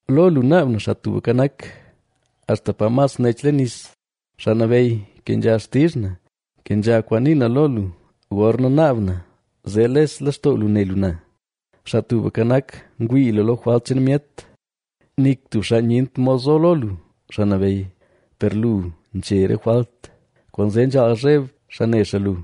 Lo lu naab na, Xaa Tubka Nak, axta pa mas nech leen nis. Xaa Nabeyy, kenzha xtizh na; kenzha kwaan nii na lo lu gorna naab na zee les lextoo lu ne lu na. Xaa Tubka Nak, ngwii lu lo jwalt cheen myet, ¡nik tub xaa nyent mod zo lo lu, Xaa Nabeyy! Per lu nche re jwalt, kwaanzee nzhaal zheb xaa ne xaa lu.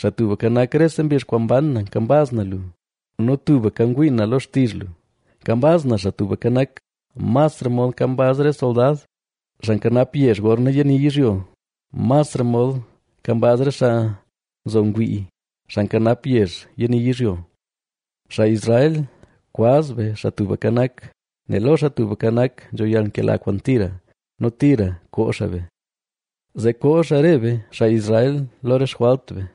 Xaa Tubka Nak, rese mbizh kwaan mban na nkambaz na lu nu tubka ngwii na lo xtizh lu. Nkambaz na Xaa Tubka Nak, masra mod nkambaz re soldad, xaa nkanap yezh gorna yani yizhyo, masra mod nkambaz re xaa nzo ngwii, xaa nkanap yezh yani yizhyo. Xaa Israel, kwaz be Xaa Tubka Nak, nel lo Xaa Tubka Nak nzho yalnkela kwaan tira nu tira koo xaa be. Zee koo xaa re be, xaa Israel, lo re xjwalt be.